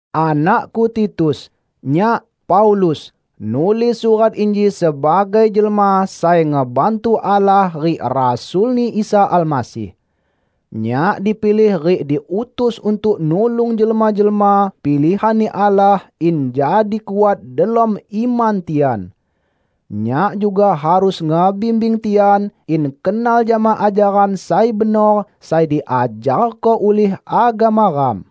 Anakku Titus! Nyak, Paulus, nulis surat inji sebagai jelma sai ngebantu Allah rik rasul-Ni Isa Almasih. Nyak dipilih rik diutus untuk nulung jelma-jelma pilihan-Ni Allah in jadi kuat delom iman tian. Nyak juga harus ngebimbing tian in kenal jama ajaran sai benor sai diajarko ulih agama ram.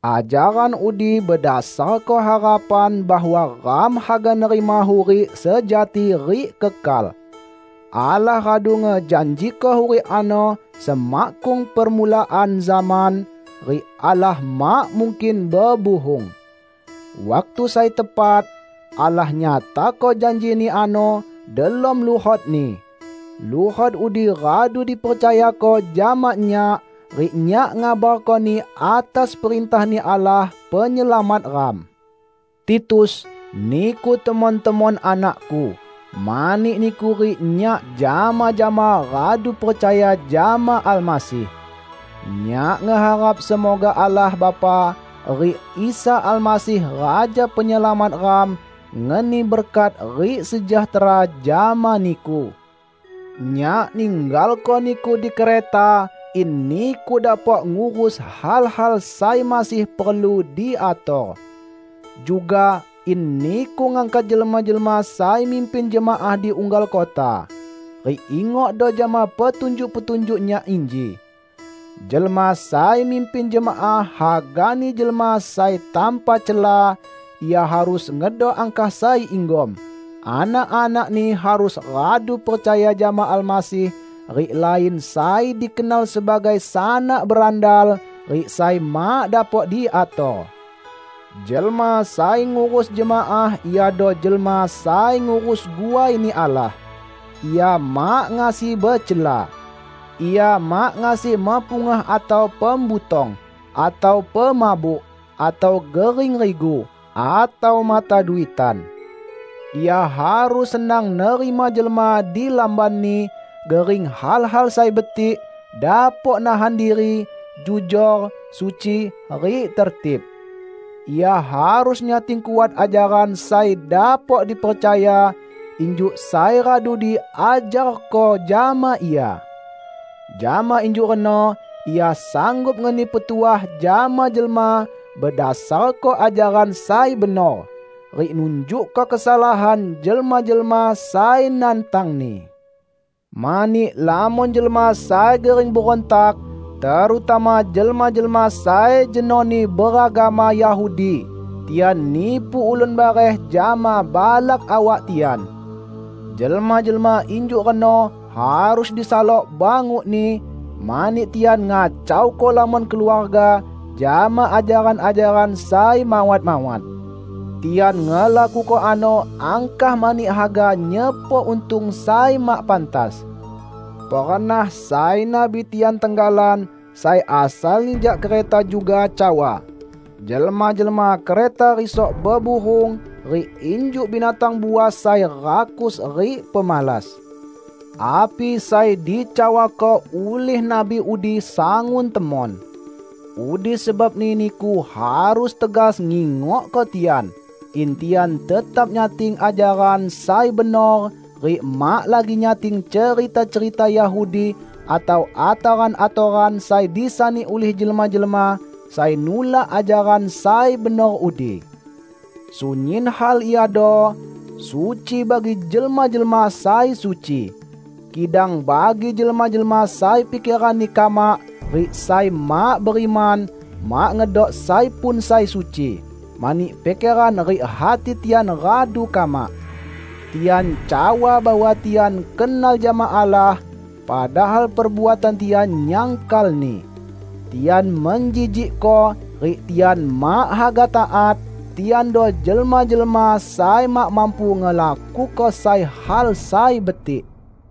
Ajaran udi bedasarko harapan bahwa ram haga nerima hurik sejati rik kekal. Allah radu ngejanjiko hurik ano semakkung permulaan zaman -- rik Allah mak mungkin bebuhung. Waktu sai tepat, Allah nyatako janji-Ni ano delom luhot-Ni. Luhot udi radu dipercayako jama nyak, rik nyak ngabarkoni atas perintah-Ni Allah Penyelamat ram. Titus, niku temon-temon anakku, mani niku rik nyak jama-jama radu percaya jama Almasih. Nyak ngeharap semoga Allah Bapa rik Isa Almasih Raja Penyelamat ram, ngeni berkat rik sejahtera jama niku. Nyak ninggalko niku di Kreta in niku dapok ngurus hal-hal sai masih perlu diator. Juga, in niku ngangkat jelma-jelma sai mimpin jemaah di unggal kota. Rik ingokdo jama petunjuk-petunjuk nyak inji: Jelma sai mimpin jemaah hagani jelma sai tanpa cela; ia harus ngedok angkah sai inggom; anak-anakni harus radu percaya jama Almasih rik lain sai dikenal sebagai sanak berandal rik sai mak dapok diator. Jelma sai ngurus jemaah iado jelma sai ngurus guai-Ni Allah, ia mak ngasi becela. Ia mak ngasi mepungah atau pembutong, atau pemabuk, atau gering rigu, atau mata duitan. Ia harus senang nerima jelma di lambanni, gering hal-hal sai betik, dapok nahan diri, jujor, suci, rik tertib. Ia harus nyating kuat ajaran sai dapok dipercaya, injuk sai radu diajarko jama ia. Jama injuk reno ia sanggup ngeni petuah jama jelma bedasarko ajaran sai benor, rik nunjukko kesalahan jelma-jelma sai nantangni. Mani lamon jelma sai gering berontak, terutama jelma-jelma sai jenoni beragama Yahudi; tian nipu ulun bareh jama balak awak tian. Jelma-jelma injuk reno harus disalok bangukni, mani tian ngacauko lamon keluarga jama ajaran-ajaran sai mawat-mawat. Tian ngelakuko ano angkah mani haga nyepok untung sai mak pantas! Pernah sai nabi tian tenggalan, sai asalni jak Kreta juga, cawa "Jelma-jelma Kreta risok bebuhung, rik injuk binatang buas sai rakus rik pemalas." Api sai dicawako ulih nabi udi sangun temon. Udi sebabni niku harus tegas ngingokko tian; in tian tetap nyating ajaran sai benor rik mak lagi nyating cerita-cerita Yahudi atau atoran-atoran sai disani ulih jelma-jelma sai nulak ajaran sai benor udi. Sunyin hal iado suci bagi jelma-jelma sai suci. Kidang bagi jelma-jelma sai pikeranni kamak rik sai mak beriman, mak ngedok sai pun sai suci, mani pikeran rik hati tian radu kamak! Tian cawa bahwa tian kenal jama Allah, padahal perbuatan tian nyangkal-Ni. Tian menjijikko, rik tian mak haga taat; tiando jelma-jelma sai mak mampu ngelakuko sai hal sai betik.